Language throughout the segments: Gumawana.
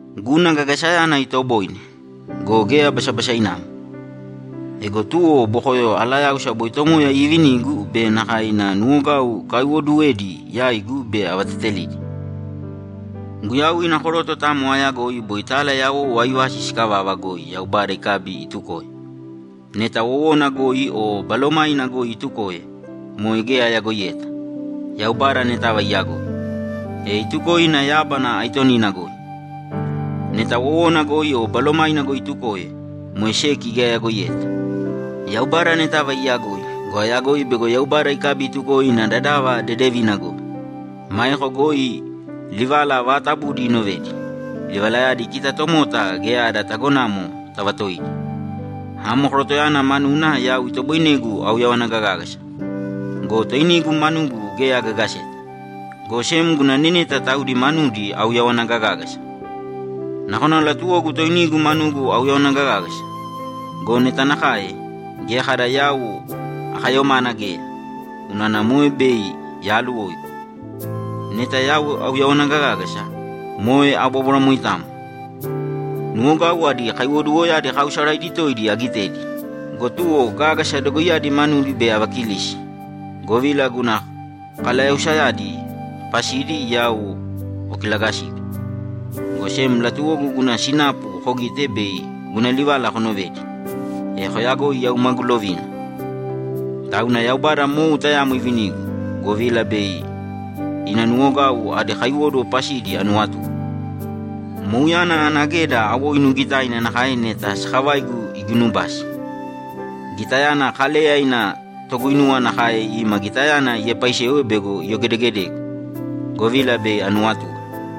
Guna gagasayana itoboine go, geya basabasainamo. Ego tuwo bokoyo alayáusa boi Tomoya iivinigu be nakae ina nuwogau ikaiwooduwedi yaigu bei avatetelidi. Guyau ina koroto tayamo aayagoi boi tala yawou aivasi sikavava goi Yaubada ikabi itukoe. Neta wowona goi o balomaina goi itukoe, moe geya ayagoiyeta. Yaubada anetava iyagoi. E itukoe ina yábana aitonina goi. Neta wowona goi o balomaina goi itukoe, moe seki geya ayagoiyeta. Yaubada anetava iyagoi go, ayagoi bego Yaubada ikabi itukoe ina dadava dedevina goi. Maeko goi livala vaatabudi inovedi; livalayadi kita tomota geya ada tagonamo tavatoidi. Amo korotoyana manuna yau itoboinegu auyawana gagágasa go, toinigu manugu geya agagaseta, go sem guna neneta taudi manudi auyawana gagágasa. Nakona latuwogu toinigu manugu auyawana gagágasa go, neta nakae, geya kada yau akayomana geya, unana moe bei yaaluwoigu. Neta yau auyawana gagágasa, moe abobóbwara moitamo. Nuwogau adi kaiwoduwoyadi kaausaraidi toidi agitedi go, tuwo gágasa dogoiyadi manudi bei avakilisi, govila guna kalayausayadi pasidi yau kokilagasigu, go sem latuwogu guna sinapu kogite bei guna livala konovedi, e koyagoi yau magu lovina. Tauna Yaubada mou tayamo ivinigu, govila bei ina nuwogau adi kaiwóduwo pasidi anuwatue. Mouyana ana geda awoinu gitaina nakae neta sakavaigu iginubasi. Gitayana Kaleya ina toguinuwa nakae ima gitayana iepaisewe bego iyogedegedegu, govila bei anuwatue.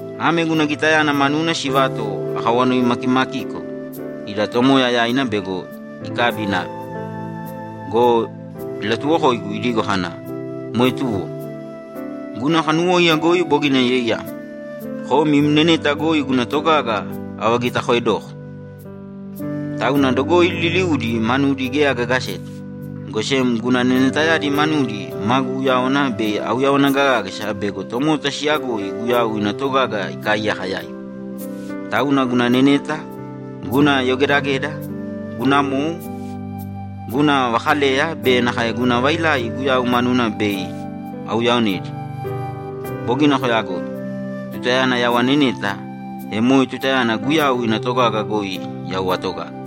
Ame guna gitayana manuna sivato akawanoimakimakiko ida Tomoya yaina bego ikabi inave go, ilatuwokoigu idigo kana, ‘Moe tuwo. Guna kanuwóiya goi bogina yoiyam. Kom im neneta goi guna togaga avagitakoedoko.’ Tauna dogoi liliudi manudi geya agagaseta, go sem guna nenetayadi manudi magu uyáwana bei auyawana gagágasa bego tomota siyagoi Guyau ina togaga ikaaiyaka yaigu. Tauna guna neneta, guna yogedageda, guna mou, guna vakaleya be nakae guna vailai Guyau manuna bei auyaaonedi. Bogina koyagoi. Tutayana yau aneneta, e moe tutayana Guyau ina togaga goi yau atogaga.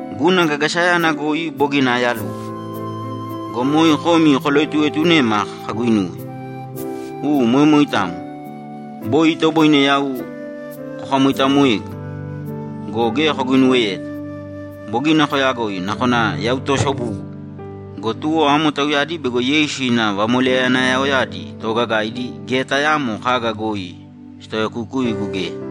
Guna gagasayana goi bogina ayaluwo! Go moe komi koloetuetunema kaguinuwe. U, moe moitamo. Boi itoboine yau kokamoitamoegu, go geya koguinuweyeta! Bogina koyagoi. Nakona yau toosobugu go, tuwo amo tauyadi bego Yeisu ina vamoleyanayaoyadi toogagaidi geya tayaamo kaga goi sitaoyakukuigu geya!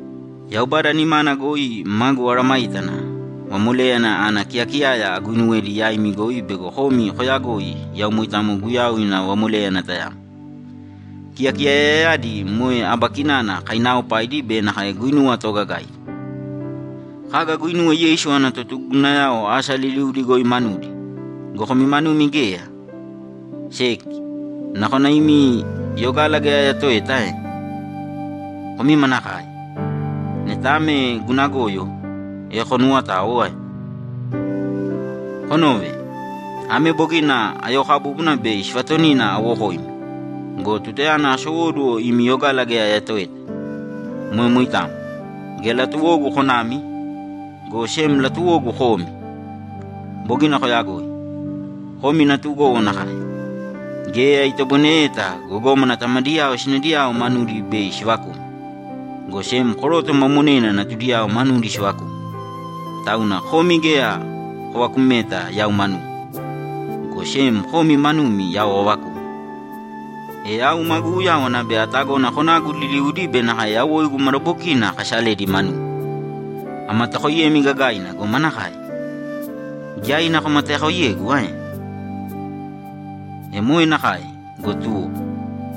Yaubada nimana goi magu mesayágana vamoléyana ana kiyakiyaya aguinuwedi yaimi goi bei komi koyagoi yau moitamo Guyau ina vamoléyana tayamo. Kiyakiyayayadi moe aba kinana kainaaopaidi be nakae guinuwa toogagaidi. Kaga aguinuwe Yeisu ana totugugunayao asa liliudi goi manudi go, komi manumi geya? Seki, nakona imi yogala geya ayatoeta ae? Komi manakae! Neta ame guna goyo, e konuwotāo ae? Konōve. Ame bogina ayookabúbuna bei sivatonina awokoimi go, tutayana asowóduwo imi yogala geya ayatoeta. Moe moitamo. Geya latuwogu konami, go sem latuwogu komi. Bogina koyagoi. Komi natugowo nakae. Geya itoboineyeta gogómana tamadiyao sinadiyao manudi bei sivakuma, go sem koroto ma monena natudiyao manudi sivakuma. Tauna komi geya kovakumeta yau manugu, go sem komi manumi yau avakuma. E yau magu uyáwana bei atagona konagu liliudi be nakae yawoigu madabokina akasaledi manumi. Amatakoiyemi gagaina go manakae? Giyaina komatakoiyegu ae? E moe nakae go, tuwo.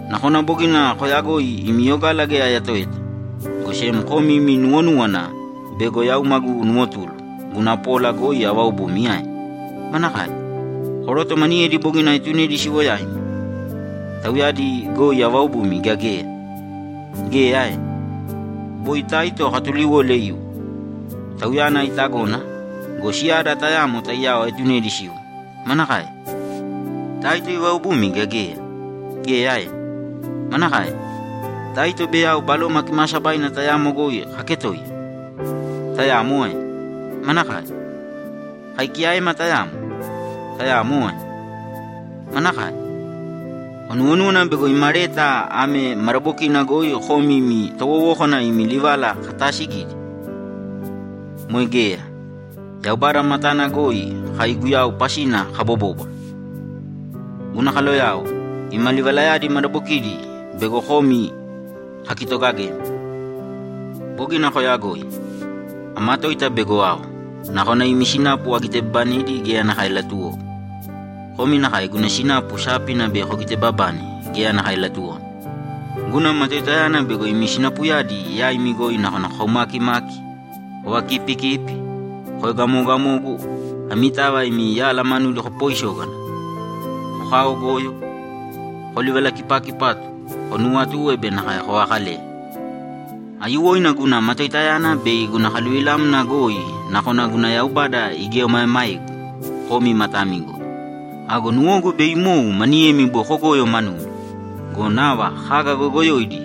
Nakona bogina koyagoi imi yogala geya ayatoeta, go sem komi imi nuwonúwana bego yau magu nuwotulu guna pola goi avaobumi ae? Manakae? Koroto maniyedi bogina aetunedi siwo yaimi, tauyadi goi avaobumi gea geya? Geya ae? Boi Taito akatuliwole iwo. Tauyana itagona go, siyada tayamo taiyao aetunedi siwo. Manakae? Taito ivaobumi gea geya? Geya ae? Manakae? Taito be yau Baloma Kimaasabaina tayamo goi kaketoiya? Tayamo ae? Manakae? Kai kiyaema tayamo? Tayamo ae? Manakae? Konuwonúwana bego ima leta ame madabokina goi komi ima towowókana imi livala kataasigidi? Moe geya. Yaubada matana goi kai Guyau pasina kabobóbwara. Guna kaloyao, ima livalayadi madabokidi bego komi kakitogagemi. Bogina koyagoi. Amatoita bego ao, nakona imi sinapu agitebabanedi geya nakae latuwogu. Komi nakae guna sinapu sápina bei kogitebabane geya nakae latuwomi. Guna matoitayana bego imi sinapuyadi yaimi goi nakona kokaumakimaki, kovakipikipi, koegamogamogu, amitava imi yala manudi kopoisógana, kokaogoyo, kolivalakipakipatu, konuwatue be nakae kovakaleya. Aiyuwoina guna matoitayana bei guna kaluvilamna goi nakona guna Yaubada igieomaemaegu komi matami goi. Ago nuwogu bei imou maniyemi boi kogoyo manumi go, nava kaga goyogoyoidi,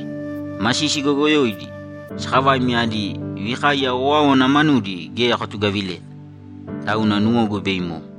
masisi goyogoyoidi, sakavaimi adi vikaiya owáowana manudi geya kotugavileta. Tauna nuwogu bei imou.